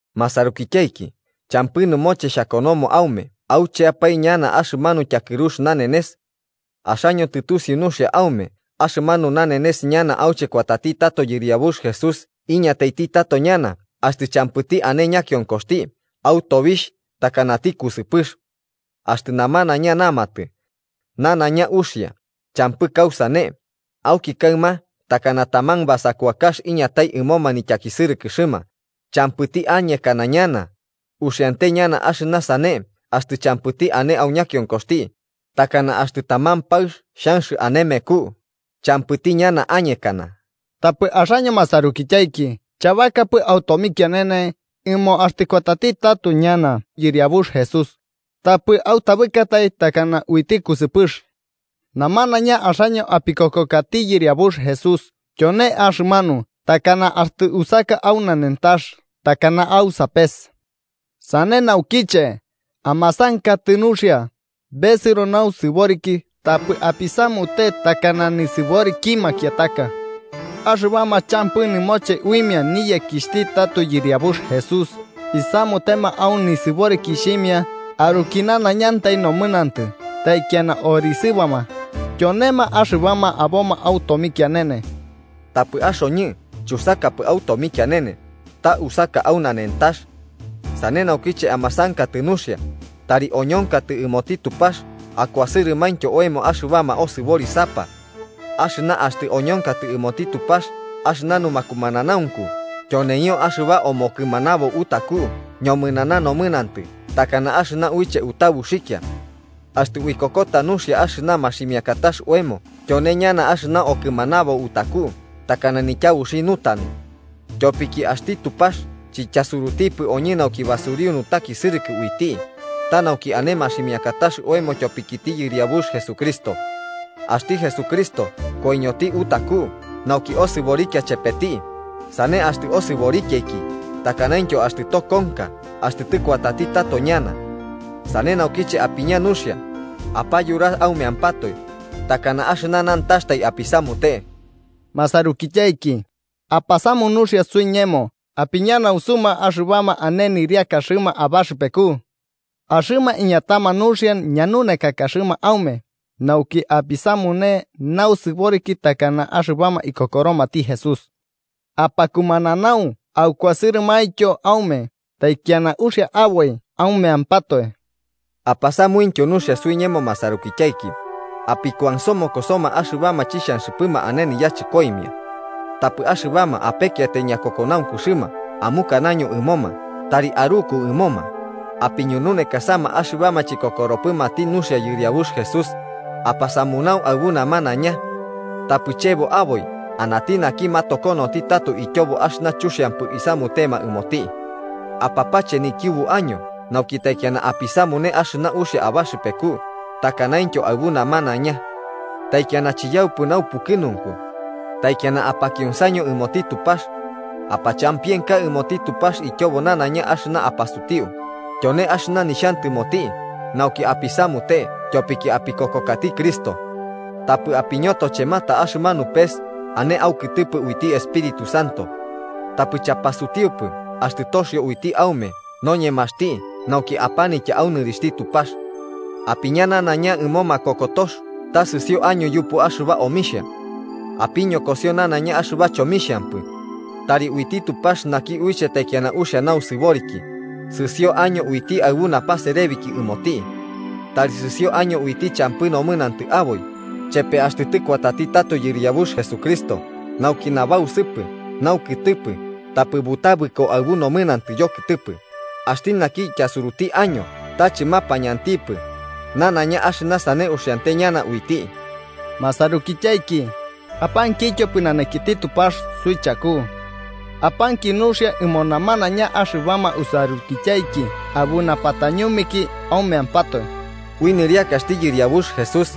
Masarukityaiki, champɨ nɨmoche xhakonomo aume aucheapae ñana axɨmanu tyakɨrux nanenes. Axaño tɨtusiu nuxia aume axɨmanu nanenes ñana auche kuatati tato Yɨriabux Jesús iñataiti tato ñana axtɨ champɨti añe ñakionkoxti, au tobixh takanati kusɨpɨx. Axtɨ namanaiña namatɨ: “Nanaiña uxia, champɨ kausane”, auki kaɨma takana taman basakuakax iñatai ɨmoma nityakisɨrɨkɨxɨma, champɨti añekana ñana, uxiante ñana axɨna sane axtɨ champɨti ane au ñakionkoxti, takana axtɨ taman paɨx xhanx ane meku. ¡Champɨti ñana añekana! Tapɨ axaño masarukityaiki chabakapɨ au tomikianene, ɨmo axtɨ kuatati tato ñana Yɨriabux Jesús tapɨ autabɨkatai takana uiti kusɨpɨx. Namanaiña axaño apikokokati Yɨriabux Jesús, tyone axɨmanu takana axtɨ usaka au nanentax takana au sapes. Sane naukiche, amasankatɨ nuxia, besɨro nausɨboriki tapɨ apisamute takana nisɨboriki makiataka. Axɨbama champɨ nɨmoche uimia niyekixhti tato Yɨriabux Jesús isamutema au nisɨborikixhimia aruki nanaiñantai nomɨnantɨ taikiana orisɨbama, tyonema axɨbama aboma au tomikianene. Tapɨ axoñɨ chusakapɨ au tomikianene, ta usaka au nanentax. Sane naukiche amasankatɨ nuxia, tari oñonkatɨ ɨmoti Tupax akuasɨrɨmaintyo oemo axɨbama osɨborisapa. ¡Axɨna axtɨ oñonkatɨ ɨmoti Tupax axɨna numakumananaunku tyoneio axɨba omokɨmanabo utaku ñomɨnana nomɨnantɨ takana axɨna uiche utabuxikia! Axtɨ uikokota nuxia axɨna maximiakatax oemo tyone ñana axɨna okɨmanabo utaku takana nityabuxi nutanu. Tyopiki axti Tupax chityasurutipɨ oñɨ nauki basuriu nutakisɨrɨkɨ uiti, ta nauki ane maximiakatax oemo tyopikiti Yɨriabux Jesucristo. Axti Jesucristo koiñoti utaku nauki osɨborikia chepeti, sane axtɨ osɨborikiaiki, takanaintyo axtɨ tokonka axtɨ tɨkuatati tato ñana. Sane naukiche, apiña nuxia, apayura aumeampatoe, takana axɨna nantaxtai apisamute. Masarukityaiki, apasamu nuxia suiñemo apiñanaunsuma axɨbama ane nɨriakaxɨma abaxɨpeku. Axɨma iñatama nuxia ñanunekakaxɨma aume nauki apisamune nausɨboriki takana axɨbama ikokoromati Jesús. Apakumananau akuasɨrɨmaintyo aume, taikiana uxia aboi aumeampatoe. Apasamuintyo nuxia suiñemo masarukityaiki, apikuansomokosoma axɨbama chixhanxɨpɨma ane yachɨkoimia. Tapɨ axɨbama apekiatai ñakokonaunkuxɨma amukanaño ɨmoma tari aruku ɨmoma, apiñununekasama axɨbama chikokoropɨmati nuxia Yɨriabux Jesús, apasamunau aɨbu namanaiña. Tapɨ chebo aboi anati naki matokonoti tato ityobo axɨna chuxiampɨ isamutema ɨmoti. Apache nikiubu año nauki taikiana apisamune axɨna uxia abaxɨpeku takanaintyo aɨbu namanaiña. Taikiana chiyaupɨ naupukɨnunku. Taikiana apakionsaño ɨmoti Tupax. Apachampienka ɨmoti Tupax ityobo nanaiña axɨna apasutiu, tyone axɨna nixhantɨmoti nauki apisamute tyopiki apikokokati Cristo. Tapɨ apiñotochemata axɨmanu pes ane aukɨtɨpɨ uiti Espíritu Santo. Tapɨ chapasutiupɨ axtɨ toxio uiti aume noñemaxti nauki apanitya au nɨrixhti Tupax. Apiña nanaiña ɨmo makokotox ta sɨsio año yupu axɨba omixhia. Apiñokosio nanaiña axɨba chomixhampɨ. Tari uiti Tupax naki uiche taikiana uxia nosɨboriki, sɨsio año uiti aɨbu napaserebiki ɨmoti. Tari sɨsio año uiti champɨ nomɨnantɨ aboi, chepe axtɨ tɨkuati tato Yɨriabux Jesucristo, nauki nabausɨpɨ, naukɨtɨpɨ tapɨ butabɨko aɨbu nomɨnantɨ yokɨtɨpɨ. Axti naki ityasuruti año ta chɨmapañantipɨ, nanaiña axɨna sane uxiante ñana uiti. Masarukityaiki, apankityo pɨnanakiti Tupax suichaku. Apanki nuxia ɨmo namanaiña axɨbama usarukityaiki aɨbu napatañumeki aumeampatoe. Ui nɨriakaxti Yɨriabux Jesús,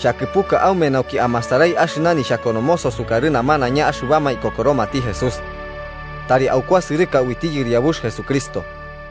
xhakɨpuka aume nauki amasarai axɨna nixhakonomoso sukarɨ namanaiña axɨbama ikokoromati Jesús. Tari aukurusɨka uiti Yɨriabux Jesucristo.